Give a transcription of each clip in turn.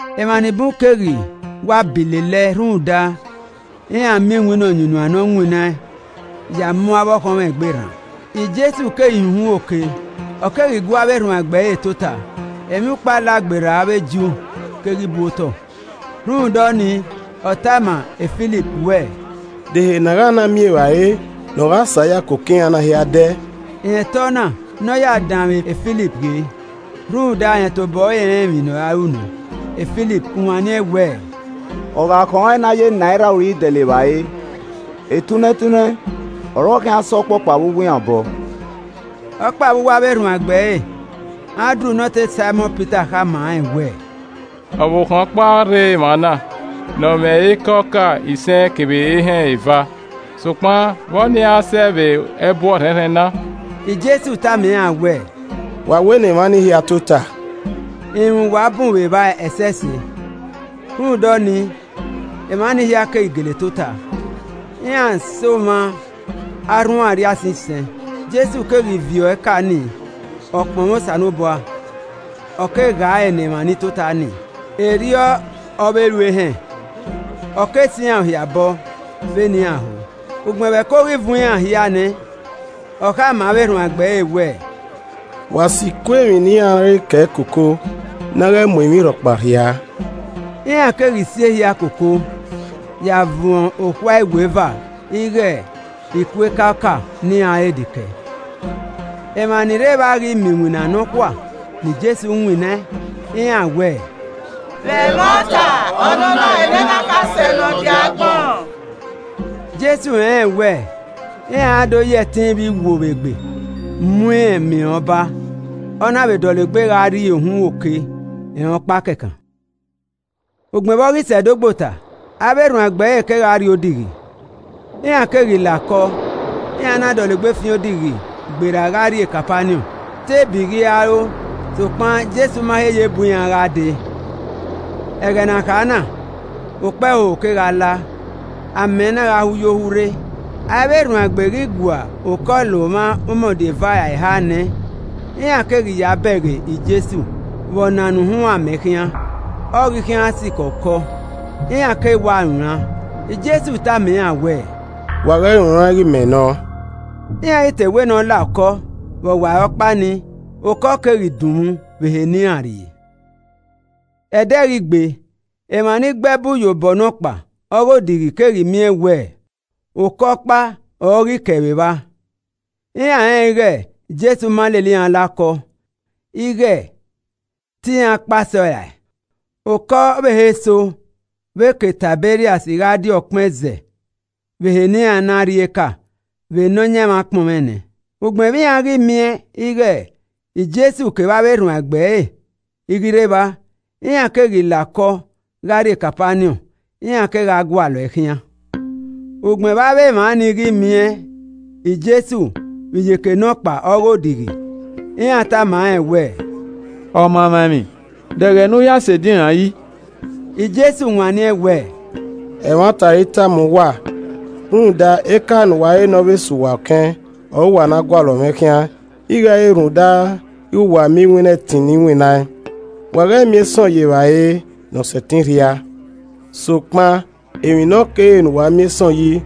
Emwa ni bun keghi wa bi lele ẹe rhunmwuda iran miẹn iwinna ọyunnuan ne ọ winnaẹn ya mu avbe ọkhọnmwọ egbe rran. Jesu keghi hin uhunmwu oke, ọ keghi gu avbe erhuanegbe ẹre tota. Emwiukpo Alagberra avbe Ju keghi bu Otọ. Rhunmwuda ọnii, ọ tama Filip wẹ, “De ehe ne a gha na miẹn evbare ne ọ gha sẹ a ya koko iran na hia dẹ?” (Rẹn ta ọna ne ọ ya danmwẹ Filip ghe rhunmwuda rẹn tobọ ẹre rẹn emwi ne ọ ra ru nẹ.) Filip wanniẹn wẹẹ, “Ọ gha khọn rẹn ne a ya enaira uri dẹlẹ evbare, etunnẹ tunnẹ ọre ọ khian sẹ ọkpọkpa vbe uwu iran obọ.” Ọkpa Vbe uwu avbe erhuanegbe ẹre, Andru ne ọtẹn Saimọn Pita khama rẹn wẹẹ, “Ọvbokhan ọkpa rre emwa na ne ọ mwẹ eka ọka isẹn kevbe ehẹn eva, sokpan vbe ọnii ara sẹ vbe ẹbu ọrhẹnrhẹn na?” Jesu tama iran wẹẹ, “Wa wẹ ne emwa ni hia tota.” (Irunmwu wa bun vbe evba ẹsẹse.) Rhunmwuda ọnii, emwa ni hia keghi gele tota. Iran sẹ omwa arhunmwu arriaisẹn isẹn. Jesu keghi viọ eka ni, ọ kpọnmwẹ Osanobua, ọ kegha ẹre ne emwa ni tota nii. Erriọ ọ vbe ru ehẹn, ọ ke sẹ iran hia obọ vbene iran ho. Ugbẹn vbe ẹko ghi vuọn iran hia nẹ, Ọ khama avbe erhuanegbe ẹre wẹẹ, “Wa si iku emwi ne iran re kẹe koko ne a ghẹ mu emwi rhọkpa rhiaa.” Iran keghi si ehia koko ya vuọn okhuae iweva ighe iku eka ọka ne iran re de kẹe. Emwa ni rre evba ghi miẹn iwinna nọkhua ne Jesu winnaẹn, iran wẹẹ, “Vbe ẹmwata, ọnọna ọrọre nene akhasẹ ne ọ die agbọn.” Jesu rẹnrẹn wẹ iran ra do ya ẹtin vbe iwo vbe egbe mu irẹn ma irẹn Ọba, ọ na vbe dọlegbe gha rrie uhunmwu oke, rẹn ọkpa kẹkan. Ugbẹn vbe ọ ghi sẹ ẹdogbota, avbe erhuanegbe ẹre kegha rrie odighi. Iran keghi la okọ, iran na dọlegbe fian odighi gberra gha rrie Kapaniọn. Te ebi ghi ro sokpan Jesu ma he ye bu iran gha dee. Ẹghẹ ne a kha na, okpẹhoho kegha la, amẹ na gha hu yo hu rre. Avbe erhuanegbe ghi gua okọ la omwa umọdia eva ra eha nẹ, iran keghi ya bẹghe Jesu vbe ọ nana uhunmwu amẹ khian, ọ ghi khian sikẹ okọ, iran keghi wa runran. Jesu tama iran wẹẹ, “Wa ghẹ runran ighe mẹ nọ.” Iran ghi te wẹ ne ọ la okọ, vbe ọwarọkpa nii okọ keghi dunmwu vbe ehe ne iran rrie. Ẹdẹ ghi gbe, emwa ni gbe ẹbu ye obọ nọkpa ọghe odighi keghi miẹn wẹ okọ ọkpa ọre ọ ghi kẹe vbe evba. Iran rẹnrẹn ighe Jesu ma lele iran la okọ, ighe te iran kpao sẹ ọe rae. Okọ ọvbehe eso vbe ke Taiberias gha die ọkpẹn ẹzẹ vbe ehe ne iran na rri eka vbe Nọyaẹnmwa kpọnmwẹ nẹ. Ugbẹn vbe iran ghi miẹn ighe Jesu kevbe avbe erhuanegbe ẹre i ghi rre evba, iran keghi la okọ gha rrie Kapaniọn, iran kegha gualọe khian. Ugbẹn vbe avbe emwa ni ghi miẹn e Jesu vbe iyeke nọkpa ọghe odighi, iran tama rẹn wẹẹ, “Ọmamwaemwi, de ẹghẹ ne u ya sẹ edinran yi?” Jesu wanniẹn wẹẹ, “Ẹmwata ọre I tama uwa, rhunmwuda eka ne uwa re ne ọ vbe sẹ uwa ọkẹn ọre uwa na gualọ mwẹ khian ighe ẹ i re rhunmwuda ighe wa miẹn iwinna ẹtin ne I winnaẹn. Wa ghẹ miẹn ẹsọn ye evbare ne ọ sẹtin rhia, sokpan emwi ne ọ kere ne uwa miẹn ẹsọn yi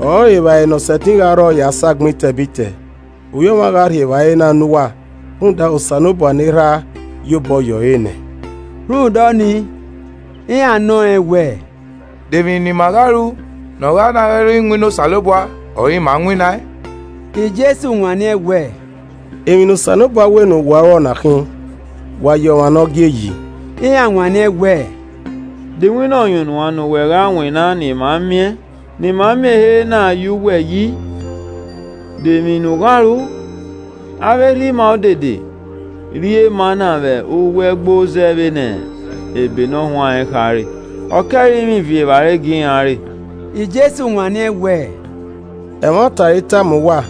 ọrọre evbare ne ọ sẹtin gha rrọọ ya sẹ agbọn etẹbitẹ. Ovbi Ọmwa gha rhie evbare na ne uwa rhunmwuda Osanobua ne Erha ye obọ yọ ọre nẹ.” Rhunmwuda ọnii, iran nọ rẹn wẹẹ, “De emwi ne ima gha ru ne ọ gha na gha re wẹ iwinna Osanobua ọre ima winnaẹn?” Jesu wanniẹn wẹẹ, “Emwi ne Osanobua wẹ ne uwa ru ọ na khin: wa ya ọmwa ne ọ gie yi.” Iran wanniẹn wẹẹ, “De iwinna ọyunnuan ne uwẹ gha winna ne ima miẹn, ne ima miẹn ehe na ya uwẹ yi? De emwi ne u gha ru? Avbe erha ima odede rri e mana vbe uwu ato zẹ vbene Ebe ne ọ huanrẹn khare. ‘Ọ ke ẹrinmwi viọ evbare gie iran re.’” Jesu wanniẹn wẹẹ, “Ẹmwata ọre I tama uwa,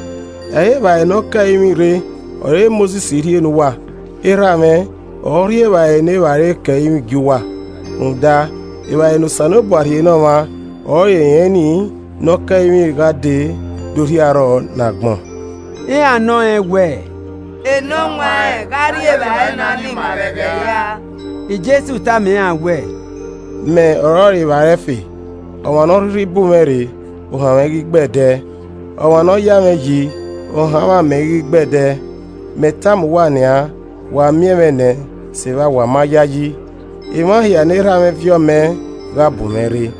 ẹ i re evbare ne ọ ke ẹrinmwi rre ọre Mosis rhie ne uwa, Erha mwẹ ọre ọ rhie evbare ne evbare ke ẹrinmwi gie uwa. Rhunmwuda evbare ne Osanobua rhie ne ọmwa ọrọre rẹn ni ne ọ ke ẹrinmwi gha dee do rhie arrọọ ne agbọn.” Iran nọ rẹn wẹẹ, “Enọwanrẹn, gha rhie evbare ni ne ima vbe ẹghẹ hia.” Jesu tama iran wẹẹ, “Mẹ ọrọre evbare ẹfe, ọmwa ne ọ rhirhi bu mwẹ rre, ohanmwẹ i ghi gbe ẹe ẹdẹ, ọmwa ne ọ vbe ya mwẹ yi, ohanmwẹ amẹ i ghi gbe ẹe ẹdẹ. Mẹ tama uwa nian, wa miẹn mwẹ nẹ, sevba wa ma yayi. Emwa hia ne Erha mwẹ viọ mẹ gha bu mwẹ rre.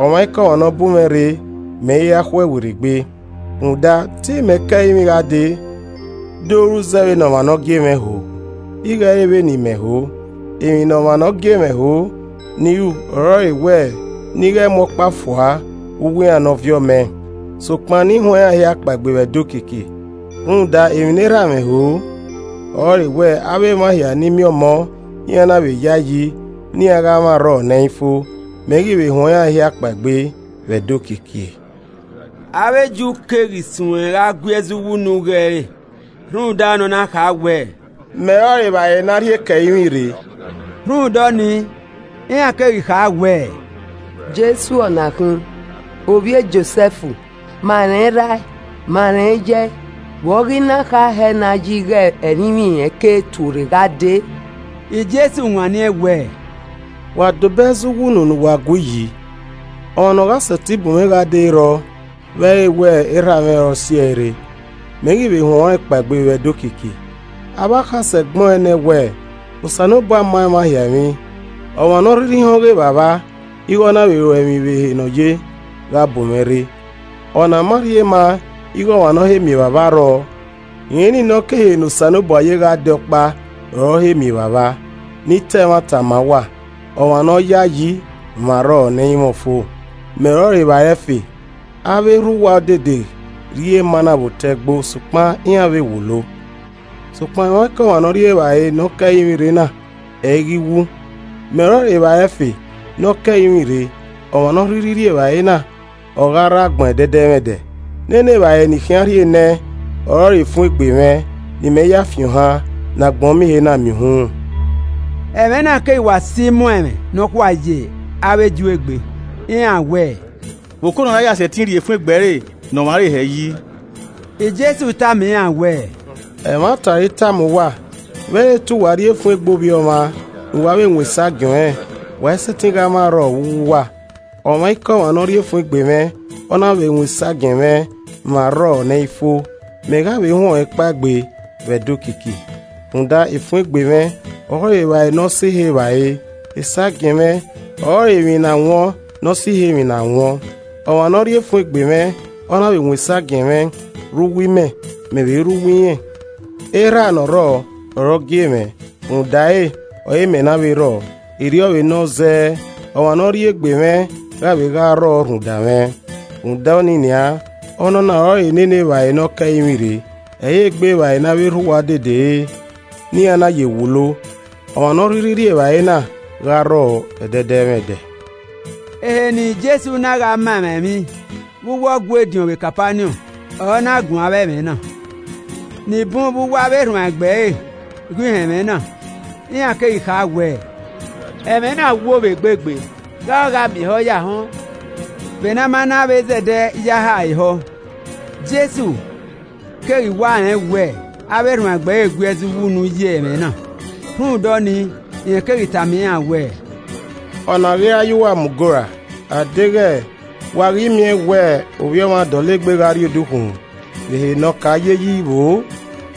Ọmwaikọmwa ne ọ bu mwẹ rre, mẹ i ra khuẹe werriegbe. Rhunmwuda, te imẹ ke ẹrinmwi gha dee do ru zẹ vbene ọmwa ne ọ gie mwẹ ho, ighe ẹ i re vbene imẹ ho. Emwi ne ọmwa ne ọ gie mwẹ ho ne I ru ọrọre wẹ ne I ghẹ mu ọkpa fua vbe uwu iran ne ọ viọ mẹ, sokpan ne I huẹn iran hia kpaegbe vbe ẹdẹ okiekie. Rhunmwuda emwi ne Erha mwẹ ho ọrọre wẹẹ avbe emwa hia ni miẹn Ọmọ, iran na vbe yae yi, ne iran gha mwẹ arrọọ ne ẹ i fo, mẹ ghi vbe huẹn iran hia kpaegbe vbe ẹdẹ okiekie.” Avbe Ju keghi suẹn gha gui ẹzọ uwu unu ghe ẹre rhunmwuda ne ọ na kha wẹ, “Mẹ ọrọre evbare ne a rhie ke ẹrinmwi rre.” Rhunmwuda ọnii, iran keghi kha wẹẹ, “Jesu ọ na khin, ovbi e Josẹf, ma rẹn erha ẹe, ma rẹn iye ẹe! Vbe ọ ghi na kha hẹ na yi ighẹ ẹrinmwi rẹn ke tuorre gha dee?” Jesu wanniẹn wẹẹ, “Wa dobọ ẹzọ uwu unu ne uwa gui yi. Ọmwa ne ọ gha sẹtin bu mwẹ gha dee ẹ i rrọọ vbe ẹ i re wẹ Erha mwẹ ọre ọ siẹe re, mẹ ghi vbe huẹn ọnrẹn kpaegbe vbe ẹdẹ okiekie. Avbe akhasẹ gbẹn ọẹn nẹ wẹẹ, ‘Osanobua ma emwa hia emwi,’ ọmwa ne ọ rhirhi họn ọghe Evbavba, ighẹ ọ na vbe ruẹ emwi vbe ehe ne ọ ye gha bu mwẹ re. Ọna ma rhie ma ighẹ ọmwa ne ọ he miẹn Evbavba rrọọ: rẹn ni ne ọ ke ehe ne Osanobua ye gha dee ọkpa ọre ọ he miẹn Evbavba. Ne I ta ẹmwata ma uwa, ọmwa ne ọ yayi, mwẹ arrọọ ne ẹ i mwẹ ọfo. Mẹ ọrọre evbare ẹfe. Avbe erha uwa odede rri e mana vbe otọ ato, sokpan iran vbe wulo. Sokpan ọmwaikọmwa ne ọ rri evbare ne ọ ke ẹrinmwi rre na, ẹ i ghi wu. Mẹ ọrọre evbare ẹfe ne ọ ke ẹrinmwi rre: ọmwa ne ọ rhirhi rri evbare na, ọ gha rre agbọn ẹdẹdẹmwẹdẹ. Nene evbare ne I khian rhie nẹẹn ọrọre efun egbe mwẹ ne imẹ ya fi ohan, ne agbọn miẹn ehe na miẹn uhunmwu.” Ẹmwẹ na keghi wa si imuan ẹmwẹ nọkhua ye avbe Ju egbe. Iran wẹẹ, “Vbe okona ra ya sẹtin rhie efun egbe ẹre ne ọmwa re hẹ yi?” Jesu tama iran wẹẹ, “Ẹmwata ọre I tama uwa, vbe ẹ i re te uwa rri efun egbe Ovbi Ọmwa ne uwa vbe wọn esagiẹn ọnrẹn, wa i sẹtin gha mwẹ arrọọ vbe uwu uwa. Ọmwaikọmwa ne ọ rri efun egbe mwẹ, ọ na vbe wọn esagiẹn mwẹ, mwẹ arrọọ ne ẹ i fo, mẹ gha vbe huẹn ọnrẹn kpaegbe vbe ẹdẹ okiekie. Rhunmwuda efun egbe mwẹ, ọrọre evbare ne ọ sẹ ihe evbare, esagiẹn mwẹ ọrọre emwi ne a wọn ne ọ sẹ ihe emwi ne a wọn. Ọmwa ne ọ rri efun egbe mwẹ, ọ na vbe wọn esagiẹn mwẹ, rre uwu imẹ, mẹ vbe rre uwu irẹn. Erha ne ọ rrọọ, ọre ọ gie mwẹ, rhunmwuda ẹre ọre imẹ na vbe rrọọ. Erriọ vbe nọ zẹẹ, ọmwa ne ọ rri egbe mwẹ gha vbe gha rrọọ rhunmwuda mwẹ. Rhunmwuda ọnii nian, ọnọna ọrọre nene evbare ne ọ ke ẹrinmwi re, ẹ i re egbe evbare ne avbe erha uwa odede re, ne iran na ye wulo, ọmwa ne ọ rhirhi rri evbare na, gha rrọọ ẹdẹdẹmwẹdẹ.” Ehe ne Jesu na gha ma emwa emwi vbe uwu Ọgua ediọn vbe Kapaniọn ọre ọ na guan avbe ẹmwẹ na. Ni bun vbe uwu avbe erhuanegbe ẹre ghi họn ẹmwẹ na, iran keghi kha wẹẹ, “Ẹmwẹ na wo vbe egbe gbe, gha ọ gha miẹn ehọ ya họn ẹn?” Vbene a ma na vbe zẹdẹ ya ha ẹre ehọ, Jesu keghi wa rẹn wẹ avbe erhuanegbe ẹre gui ẹzọ uwu unu ye ẹmwẹ na, rhunmwuda ọnii, rẹn keghi tama iran wẹẹ, “Ọ na ọ ghi ra ya uwa mu goo ra? A deghẹ wa ghi miẹn wẹ Ovbi Ọmwa dọlegbe gha rrie odukhunmwu vbe ehe ne ọ ka ye yi vbo?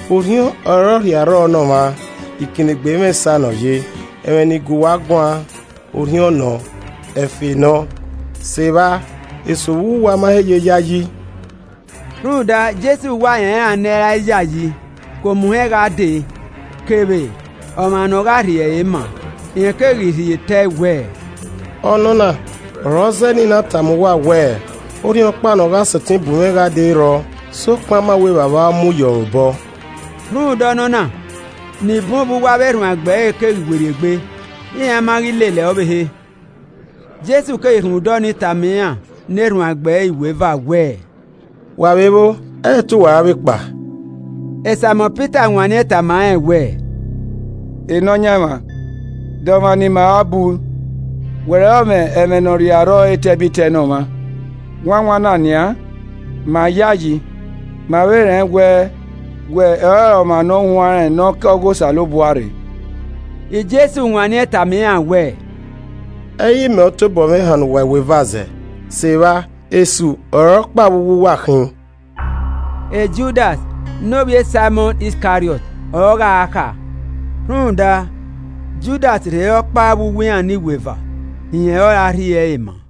Orhiọn ọre ọ rhie arrọọ ne ọmwa, ikinnegbe i mwẹ esa ne ọ ye. Ẹmwẹ ne I gu uwa guan, Orhiọn nọ, ẹfe nọ. Sevba, eso vbe uwu uwa ma he ye yayi.” (Rhunmwuda Jesu wa rẹn iran ne ẹ i ra yayi ke omuhẹn gha dee kevbe ọmwa ne ọ gha rhie ẹre maa.) Rẹn keghi rhie te ẹe wẹẹ, “Ọnọna ọre ọ zẹẹ ne I na tama uwa wẹ orhiọnkpa ne ọ gha sẹtin bu mwẹ gha dee ẹ i rrọọ, sokpan a ma wẹ Evbavba ọre ọ mu ye ọre obọ.” Rhunmwuda ọnọna, ni bun vbe uwu avbe erhuanegbe ẹre keghi werriegbe, iran ma ghi lele ẹe ọvbehe. Jesu keghi rhunmwuda ọnii tama iran ne erhuanegbe iweva wẹẹ, “Wa vbe vbo, ẹ i re te uwa ra vbe kpao?” Saimọn Pita wanniẹn tama rẹn wẹẹ, “Nọyaẹnmwa, de ọmwa ne ima ra bu? Wẹ ọre ọ mwẹ ẹmwẹ ne ọ rhie arrọọ etẹbitẹ ne ọmwa. Wanwan na nian, ma yayi, ma vbe rẹn wẹ, wẹ ọrọre ọmwa Ne ọ huanrẹn ne ọ ke ọghe Osanobua rre.” Jesu wanniẹn tama iran wẹẹ, “Ẹ i re imẹ ọre ọ tobọ mwẹ hannọ uwa iweva zẹ? Sevba esu ọre ọkpa vbe uwu uwa khin!” Judas ne ovbi Saimọn Iskariọt ọre ọ gha kha. Rhunmwuda Judas rhe re ọkpa vbe uwu iran ne iweva rẹn ọre ọ ra rhie ẹre ma an.